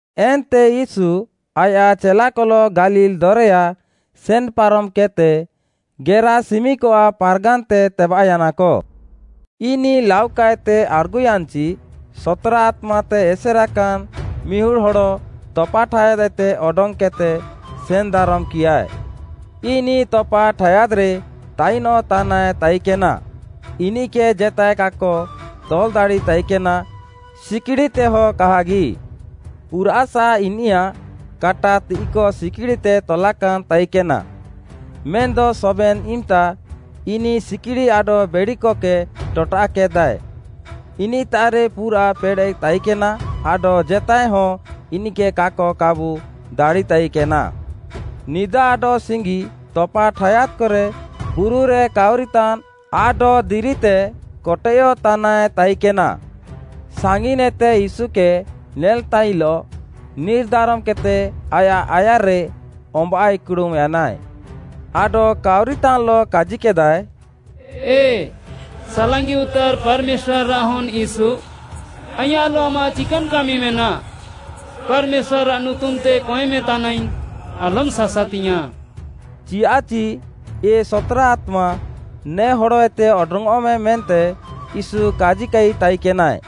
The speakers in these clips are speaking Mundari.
ଏନ୍ତେ ୟୀଶୁ ଆୟାଃ ଚେଲାକଲଃ ଗାଲିଲ୍‌ ଦରେୟା ସେନ୍‌ପାରମ୍‌କେଦ୍‌ତେ ଗେରାସିମିକଆଃ ପାର୍‌ଗାନ୍‌ତେ ତେବାଃୟାନାକ। ଇନିଃ ଲାଉକାଏତେ ଆଡ଼୍‌ଗୁୟାନ୍‌ଚି, ସତ୍‌ରା ଆତ୍ମାତେ ଏସେରାକାନ୍‌ ମିହୁଡ଼୍‌ ହଡ଼ ତପାଠାୟାଦ୍‌ଏତେ ଅଡଙ୍ଗ୍‌କେଦ୍‌ତେ ସେନ୍‌ଦାରମ୍‌କିୟାଏ। ଇନିଃ ତପା ଠାୟାଦ୍‌ରେ ତାଇନଃତାନାଏ ତାଇକେନା, ଇନିଃକେ ଜେତାଏ କାକ ତଲ୍‌ ଦାଡ଼ିତାଇକେନା, ସିକ୍‌ଡ଼ିତେହଁ କାହାଗି। ପୁରାଃସା ଇନିୟାଃ କାଟା ତିଃଇକ ସିକ୍‌ଡ଼ିତେ ତଲାକାନ୍‌ ତାଇକେନାଏ, ମେନ୍‌ଦ ସବେନ୍‌ ଇମ୍‌ତା ଇନିଃ ସିକ୍‌ଡ଼ି ଆଡଃ ବେଡ଼ିକକେ ଟଟାଃକେଦାଏ। ଇନିଃତାଃରେ ପୁରାଃ ପେଡ଼େଃ ତାଇକେନା ଆଡଃ ଜେତାଏ ହଁ ଇନିଃକେ କାକ କାବୁ ଦାଡ଼ିତାଇକେନା। ନିଦା ଆଡଃ ସିଙ୍ଗି ତପା ଠାୟାଦ୍‌କରେ, ବୁରୁରେ କାଉରିତାନ୍‌ ଆଡଃ ଦିରିତେ କଟେୟଃତାନାଏ ତାଇକେନା। ସାଙ୍ଗିନ୍‌ଏତେ ୟୀଶୁକେ ନେଲ୍‌ତାଇଲଃ ନିର୍‌ଦାରମ୍‌କେଦ୍‌ତେ ଆୟାଃ ଆୟାର୍‌ରେ ଅମ୍ବାଃ ଇକ୍‌ଡ଼ୁମ୍‌ ୟାନାଏ। ଆଡଃ କାଉରିତାନ୍‌ଲଃ କାଜିକେଦାଏ, “ଏ, ସାଲାଙ୍ଗିଉତାର୍‌ ପାର୍‌ମେଶ୍ୱାର୍‌ଆଃ ହନ୍‌ ୟୀଶୁ, ଆଇଁୟାଃଲଃ ଆମାଃ ଚିକାନ୍‌ କାମି ମେନାଃ? ପାର୍‌ମେଶ୍ୱାର୍‌ରାଃ ନୁତୁମ୍‌ତେ କଏଁମେ ତାନାଇଙ୍ଗ୍‌, ଆଲମ୍‌ ସାସାତିଆଁ।” ଚିୟାଃଚି “ଏ, ସତ୍‌ରା ଆତ୍ମା, ନେ ହଡ଼ଏତେ ଅଡଙ୍ଗ୍‌ଅଃମେ” ମେନ୍ତେ ୟୀଶୁ କାଜିକାଇ ତାଇକେନାଏ।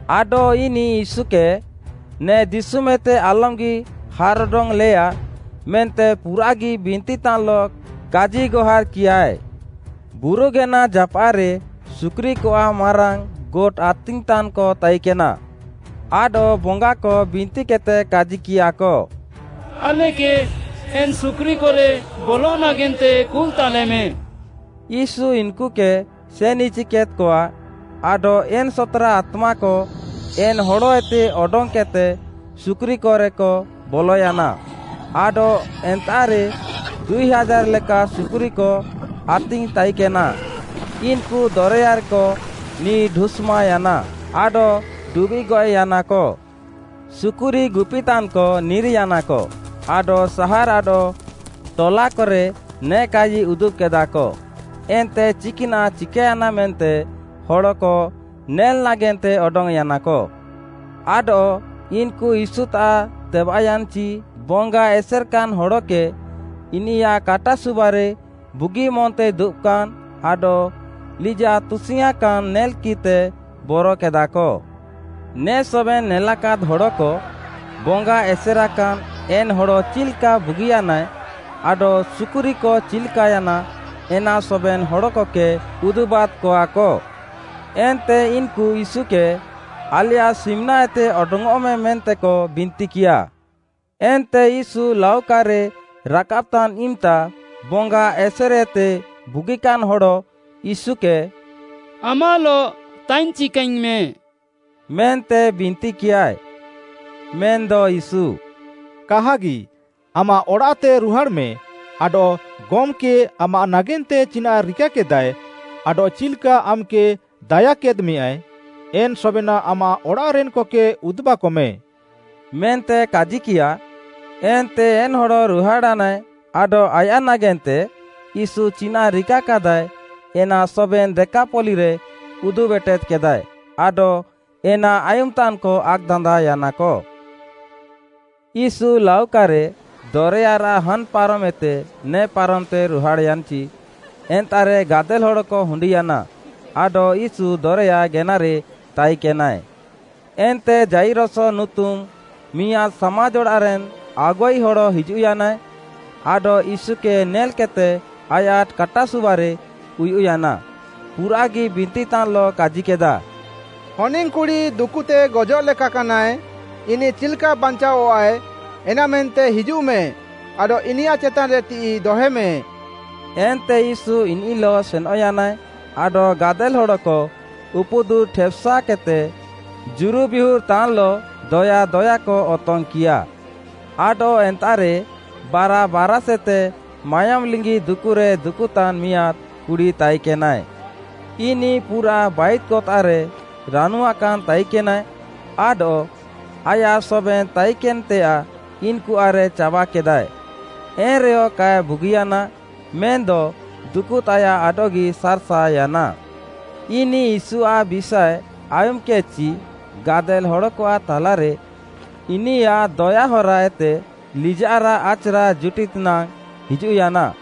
ଆଡଃ ଇନିଃ ୟୀଶୁକେ, ନେ ଦିଶୁମ୍‌ଏତେ ଆଲମ୍‌ଗି ହାର୍‌ ଅଡଙ୍ଗ୍‌ଲେୟା, ମେନ୍ତେ ପୁରାଃଗି ବିନ୍ତିତାନ୍‌ଲଃ କାଜିଗହାର୍‌କିୟାଏ। ବୁରୁଗେନା ଜାପାଃରେ ସୁକୁରିକଆଃ ମାରାଙ୍ଗ୍‌ ଗୋଟ୍‌ ଆତିଙ୍ଗ୍‌ତାନ୍‌କ ତାଇକେନା। ଆଡଃ, ବଙ୍ଗାକ ବିନ୍ତିକେଦ୍‌ତେ କାଜିକିୟାଃକ, “ଆଲେକେ ଏନ୍‌ ସୁକୁରିକରେ ବଲଃ ନାଗେନ୍ତେ କୁଲ୍‌ତାଲେମେ।” ୟୀଶୁ ଇନ୍‌କୁକେ ସେନ୍‌ଇଚିକେଦ୍‌କଆ, ଆଡଃ ଏନ୍‌ ସତ୍‌ରା ଆତ୍ମାକ ଏନ୍‌ ହଡ଼ଏତେ ଅଡଙ୍ଗ୍‌କେଦ୍‌ତେ ସୁକୁରିକରେକ ବଲୟାନା, ଆଡଃ ଏନ୍ତାଃରେ ଦୁଇ ହାଜାର୍‌ ଲେକା ସୁକୁରିକ ଆତିଙ୍ଗ୍‌ ତାଇକେନା, ଇନ୍‌କୁ ଦରେୟାରେକ ନିର୍‌ ଢୁଷ୍‌ମାଅୟାନା ଆଡଃ ଡୁବିଃଗ୍‌ ଗଏଃୟାନାକ। ସୁକୁରି ଗୁପିତାନ୍‌କ ନିର୍‌ୟାନାକ ଆଡଃ ସାହାର୍‌ ଆଡଃ ଟଲାକରେ ନେ କାଜିକ ଉଦୁବ୍‌କେଦାଃ, ଏନ୍ତେ ଚିକ୍‌ନାଃ ଚିକାୟାନା ମେନ୍ତେ ହଡ଼କ ନେଲ୍‌ ନାଗେନ୍ତେ ଅଡଙ୍ଗ୍‌ୟାନାକ। ଆଡଃ ଇନ୍‌କୁ ୟୀଶୁତାଃ ତେବାଃୟାନ୍‌ଚି ବଙ୍ଗା ଏସେର୍‌କାନ୍‌ ହଡ଼କେ ଇନିୟାଃ କାଟାସୁବାରେ ବୁଗିନ୍‌ମନ୍‌ତେ ଦୁବାକାନ୍‌, ଆଡଃ ଲିଜାଃ ତୁସିଙ୍ଗ୍‌ଆଁକାନ୍‌ ନେଲ୍‌କିଃତେ ବରକେଦାଃକ। ନେ ସବେନ୍‌ ନେଲାକାଦ୍‌ ହଡ଼କ, ବଙ୍ଗା ଏସେର୍‌କାନ୍‌ ଏନ୍‌ ହଡ଼ ଚିଲ୍‌କା ବୁଗିୟାନାଏ ଆଡଃ ସୁକୁରିକ ଚିଲ୍‌କାୟାନା ଏନା ସବେନ୍‌ ହଡ଼କକେ ଉଦୁବାଦ୍‌କଆକ। ଏନ୍ତେ ଇନ୍‌କୁ ୟୀଶୁକେ, ଆଲେୟାଃ ସିମ୍‌ନାଏତେ, ଅଡଙ୍ଗ୍‌ଅଃମେ ମେନ୍ତେକ ବିନ୍ତିକିୟା। ଏନ୍ତେ ୟୀଶୁ ଲାଉକାରେ ରାକାବ୍‌ତାନ୍‌ ଇମ୍‌ତା, ବଙ୍ଗା ଏସେର୍‌ଏତେ ବୁଗିକାନ୍‌ ହଡ଼, ୟୀଶୁକେ “ଆମାଃଲଃ ତାଇନ୍‌ ଚିକାଆଇଙ୍ଗ୍‌ମେଁ” ମେନ୍ତେ ବିନ୍ତିକିୟାଏ। ମେନ୍‌ଦ ୟୀଶୁ “କାହାଗି, ଆମାଃ ଅଡ଼ାଃତେ ରୁହାଡ଼୍‌ମେଁ ଆଡଃ ଗମ୍‌କେ ଆମାଃ ନାଗେନ୍ତେ ଚିନାଃ ରିକାକେଦାଃଏ, ଆଡଃ ଚିଲ୍‌କା ଆମ୍‌କେ ଦାୟାକାଦ୍‌ମେୟା ଏନ୍‌ ସବେନାଃ ଆମାଃ ଅଡ଼ାଃରେନ୍‌କକେ ଉଦୁବାକମେ” ମେନ୍ତେ କାଜିକିୟା। ଏନ୍ତେ ଏନ୍‌ ହଡ଼ ରୁହାଡ଼୍‌ୟାନାଏ ଆଡଃ ଆୟାଃ ନାଗେନ୍ତେ ୟୀଶୁ ଚିନାଃ ରିକାକେଦାଃଏ ଏନା ସବେନ୍‌ ଦେକାପଲ୍ଲୀରେ ଉଦୁବ୍‌ ଏଟେଦ୍‌କେଦାଏ, ଆଡଃ ଏନା ଆୟୁମ୍‌ତାନ୍‌କ ଆକ୍‌ଦାନ୍ଦାଅୟାନା। ୟୀଶୁ ଲାଉକାରେ ଦରେୟାରାଃ ହାନ୍‌ ପାରମ୍‌ଏତେ ନେ ପାରମ୍‌ତେ ରୁହାଡ଼୍‌ୟାନ୍‌ଚି, ଏନ୍ତାଃରେ ଗାଦେଲ୍‌ ହଡ଼କ ହୁଣ୍ଡିୟାନା, ଆଡଃ ୟୀଶୁ ଦରେୟା ଗେନାରେ ତାଇକେନାଏ। ଏନ୍ତେ ଯାଇରସ ନୁତୁମ୍‌ ମିଆଁଦ୍‌ ସାମାଜ୍‌ଅଡ଼ାଃରେନ୍‌ ଆଗୁଆଇ ହଡ଼ ହିଜୁଃୟାନାଏ, ଆଡଃ ୟୀଶୁକେ ନେଲ୍‌କେଦ୍‌ତେ ଆୟାଃ କାଟାସୁବାରେ ଉୟୁଃୟାନା, ପୁରାଃଗି ବିନ୍ତିତାନ୍‌ଲଃ କାଜିକେଦା, “ହନିଙ୍ଗ୍‌କୁଡ଼ି ଦୁକୁତେ ଗଜଃ ଲେକାକାନାଏ, ଇନିଃ ଚିଲ୍‌କା ବାଞ୍ଚାଅଃଆଏ, ଏନାମେନ୍ତେ ହିଜୁଃମେ, ଆଡଃ ଇନିୟାଃ ଚେତାନ୍‌ରେ ତିଃଇ ଦହେମେ।” ଏନ୍ତେ ୟୀଶୁ ଇନିଃଲଃ ସେନଃୟାନାଏ ଆଡଃ ଗାଦେଲ୍‌ ହଡ଼କ ଉପୁଦୁର୍‌ଠେପ୍‌ସାକେଦ୍‌ତେ ଜୁରୁବିହୁର୍‌ ତାନ୍‌ଲଃ ଦୟା ଦୟାକ ଅତଙ୍ଗ୍‌କିୟା। ଆଡଃ ଏନ୍ତାଃରେ ବାରା ବାରାଷ୍‌ଏତେ “ମାୟୋମ୍‌ଲିଙ୍ଗି” ଦୁକୁରେ ଦୁକୁତାନ୍‌ ମିଆଁଦ୍‌ କୁଡ଼ି ତାଇକେନାଏ। ଇନିଃ ପୁରାଃ ବାଇଦ୍‌କତାଃରେ ରାନୁଆକାନ୍‌ ତାଇକେନାଏ, ଆଡଃ ଆୟାଃ ସବେନ୍‌ ତାଇକେନ୍‌ତେୟାଃ ଇନ୍‌କୁଆଃରେ ଚାବାକେଦାଏ, ଏନ୍‌ରେୟ କାଏ ବୁଗିୟାନା, ମେନ୍‌ଦ, ଦୁକୁତାୟାଃ ଆଡଃଗି ସାର୍‌ସାଅୟାନା। ଇନିଃ ୟୀଶୁଆଃ ବିଷାଏ ଆୟୁମ୍‌କେଦ୍‌ଚି ଗାଦେଲ୍‌ ହଡ଼କଆଃ ଥାଲାରେ ଇନିୟାଃ ଦୟାହରା ଏତେ ଲିଜାଃରାଃ ଆଚ୍‌ରା ଜୁଟିଦ୍‌ ନାଙ୍ଗ୍‌ ହିଜୁଃୟାନା,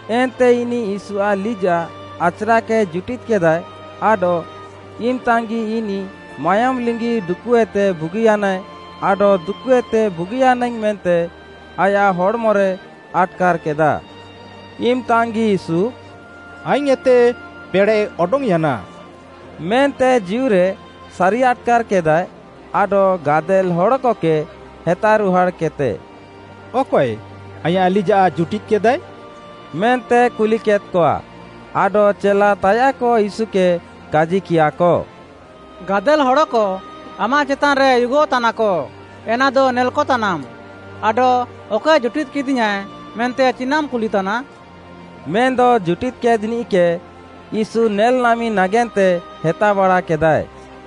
ଏନ୍ତେ ଇନିଃ ୟୀଶୁଆଃ ଲିଜାଃ ଆଚ୍‌ରାକେ ଜୁଟିଦ୍‌କେଦାଏ ଆଡଃ, ଇମ୍‌ତାଙ୍ଗ୍‌ଗି ଇନିଃ ମାୟୋମ୍‌ ଲିଙ୍ଗି ଦୁକୁଏତେ ବୁଗିୟାନାଏ। ଆଡଃ ଦୁକୁଏତେ ବୁଗିୟାନାଇଙ୍ଗ୍‌ ମେନ୍ତେ ଆୟାଃ ହଡ଼୍‌ମରେ ଆଟ୍‌କାର୍‌କେଦା। ଇମ୍‌ତାଙ୍ଗ୍‌ଗି ୟୀଶୁ, “ଆଇଙ୍ଗ୍‌ଏତେ ପେଡ଼େଃ ଅଡଙ୍ଗ୍‌ୟାନା” ମେନ୍ତେ ଜୀଉରେ ସାରିଆଟ୍‌କାର୍‌କେଦାଏ, ଆଡଃ ଗାଦେଲ୍‌ ହଡ଼କକେ ହେତାରୁହାଡ଼୍‌କେଦ୍‌ତେ, “ଅକଏ, ଆଇଁୟାଃ ଲିଜାଃ ଜୁଟିଦ୍‌କେଦାଏ?” ମେନ୍ତେ କୁଲିକେଦ୍‌କଆ। ଆଡଃ ଚେଲା ତାୟାଃକ ୟୀଶୁକେ କାଜିକିୟାଃକ, “ଗାଦେଲ୍‌ ହଡ଼କ ଆମାଃ ଚେତାନ୍‌ରେ ଉୟୁଗଃତାନାକ, ଏନାଦ ନେଲ୍‌କତାନାମ୍‌, ଆଡଃ ‘ଅକଏ ଜୁଟିଦ୍‌କିଦିୟାଁଏ,’ ମେନ୍ତେ ଚିନାଃମ୍‌ କୁଲିତାନା?” ମେନ୍‌ଦ ଜୁଟିଦ୍‌କେଦ୍‌ନିଃକେ ୟୀଶୁ ନେଲ୍‌ନାମି ନାଗେନ୍ତେ ହେତାବାଡ଼ାକେଦାଏ।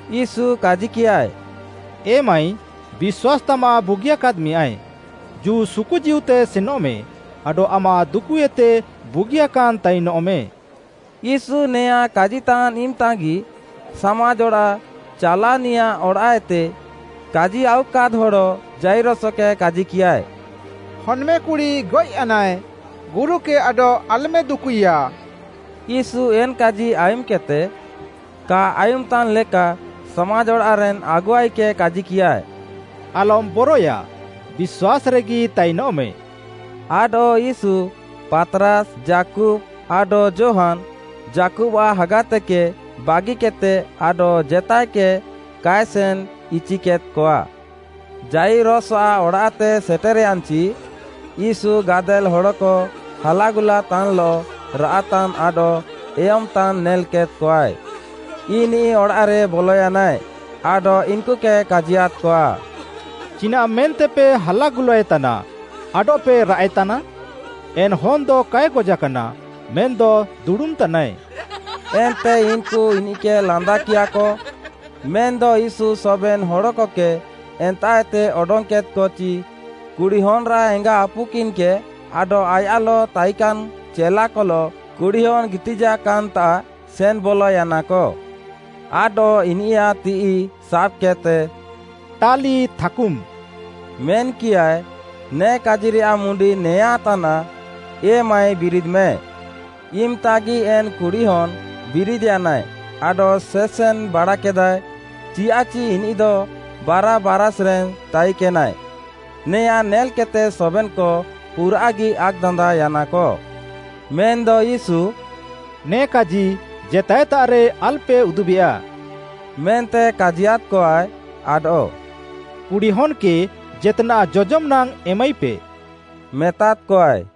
ୟୀଶୁ କାଜିକିୟାଏ, “ଏ ମାଈ, ବିଶ୍ୱାସ୍‌ ତାମାଃ ବୁଗିୟାକାଦ୍‌ମେଁୟାଏ, ଜୁ ସୁକୁ ଜୀଉତେ ସେନଃମେ, ଆଡଃ ଆମାଃ ଦୁକୁଏତେ ବୁଗିୟାକାନ୍‌ ତାଇନଃମେ।” ୟୀଶୁ ଏନା କାଜିତାନ୍‌ ଇମ୍‌ତାଗି, ସାମାଜ୍‌ ଅଡ଼ାଃ ଚାଲାଅନିୟାଃ ଅଡ଼ାଃଏତେ କାଜି ଆଉୱାକାଦ୍‌ ହଡ଼ ଯାଇରସକେ କାଜିକିୟାଏ, “ହନ୍‌ମେକୁଡ଼ି ଗଏଃୟାନାଏ, ଗୁରୁକେ ଆଡଃ ଆଲ୍‌ମେ ଦୁକୁଇୟା।” ୟୀଶୁ ଏନ୍‌କାଜି ଆୟୁମ୍‌କେଦ୍‌ତେ କା ଆୟୁମ୍‌ତାନ୍‌ ଲେକା ସାମାଜ୍‌ଅଡ଼ାଃରେନ୍‌ ଆଗୁଆଇକେ କାଜିକିୟା, “ଆଲମ୍‌ ବରଏୟା, ବିଶ୍ୱାସ୍‌ରେଗି ତାଇନଃମେ।” ଆଡଃ ୟୀଶୁ, ପାତ୍‌ରାସ୍‌, ଯାକୁବ୍‌, ଆଡଃ ଯୋହାନ୍‌, ଯାକୁବ୍‌ଆଃ ହାଗାତେକେ ବାଗିକେଦ୍‌ତେ ଆଡଃ ଜେତାଏକକେ କାଏ ସେନ୍‌ ଇଚିକେଦ୍‌କଆ। ଯାଇରସଆଃ ଅଡ଼ାଃତେ ସେଟେର୍‌ୟାନ୍‌ଚି, ୟୀଶୁ ଗାଦେଲ୍‌ ହଡ଼କ ହାଲାଗୁଲାତାନ୍‌ଲଃ, ରାଆଃତାନ୍‌ ଆଡଃ ଏୟମ୍‌ତାନ୍‌ ନେଲ୍‌କେଦ୍‌କଆଏ। ଇନିଃ ଅଡ଼ାଃରେ ବଲୟାନାଏ, ଆଡଃ ଇନ୍‌କୁକେ କାଜିୟାଦ୍‌କଆ, “ଚିନାଃ ମେନ୍ତେପେ ହାଲାଗୁଲାଏତାନା ଆଡଃପେ ରାଆଃଏତାନା? ଏନ୍‌ ହନ୍‌ଦ କାଏ ଗଜାକାନା ମେନ୍‌ଦ ଦୁଡ଼ୁମ୍‌ତାନାଏ।” ଏନ୍ତେ ଇନ୍‌କୁ ଇନିଃକେ ଲାନ୍ଦାକିୟାଃକ। ମେନ୍‌ଦ ୟୀଶୁ ସବେନ୍‌ ହଡ଼କକେ ଏନ୍ତାଃଏତେ ଅଡଙ୍ଗ୍‌କେଦ୍‌କଚି, କୁଡ଼ିହନ୍‌ରାଃ ଏଙ୍ଗାଆପୁକିନ୍‌ ଆଡଃ ଆୟାଃଲଃ ତାଇକାନ୍‌ ଚେଲାକଲଃ, କୁଡ଼ିହନ୍‌ ଗିତିଜାକାନ୍‌ତାଃ ସେନ୍‌ ବଲୟାନାକ। ଆଡଃ ଇନିୟାଃ ତିଃଇ ସାବ୍‌କେଦ୍‌ତେ “ଟାଲିଥାକୁମ୍‌” ମେନ୍‌କିୟାଏ, ନେ କାଜିରେୟାଃ ମୁଣ୍ଡି ନେଆଁଁ ତାନାଃ, “ଏ ମାଈ ବିରିଦ୍‌ମେ।” ଇମ୍‌ତାଗି ଏନ୍‌ କୁଡ଼ିହନ୍‌ ବିରିଦ୍‌ୟାନାଏ ଆଡଃ ସେସେନ୍‌ ବାଡ଼ାକେଦାଏ, ଚିୟାଃଚି ଇନିଃଦ ବାରା ବାରାଷ୍‌ରେନ୍‌ ତାଇକେନାଏ। ନେଆଁଁ ନେଲ୍‌କେଦ୍‌ତେ ସବେନ୍‌କ ପୁରାଃଗି ଆକ୍‌ଦାନ୍ଦାଅୟାନାକ। ମେନ୍‌ଦ ୟୀଶୁ “ନେ କାଜି ଜେତାଏତାଃରେ ଆଲ୍‌ପେ ଉଦୁବେୟା,” ମେନ୍ତେ କାଜିୟାଦ୍‌କଆଏ, ଆଡଃ “କୁଡ଼ିହନ୍‌କେ ଜେତ୍‌ନାଃ ଜଜମ୍‌ ନାଙ୍ଗ୍‌ ଏମାଇପେ” ମେତାଦ୍‌କଆଏ।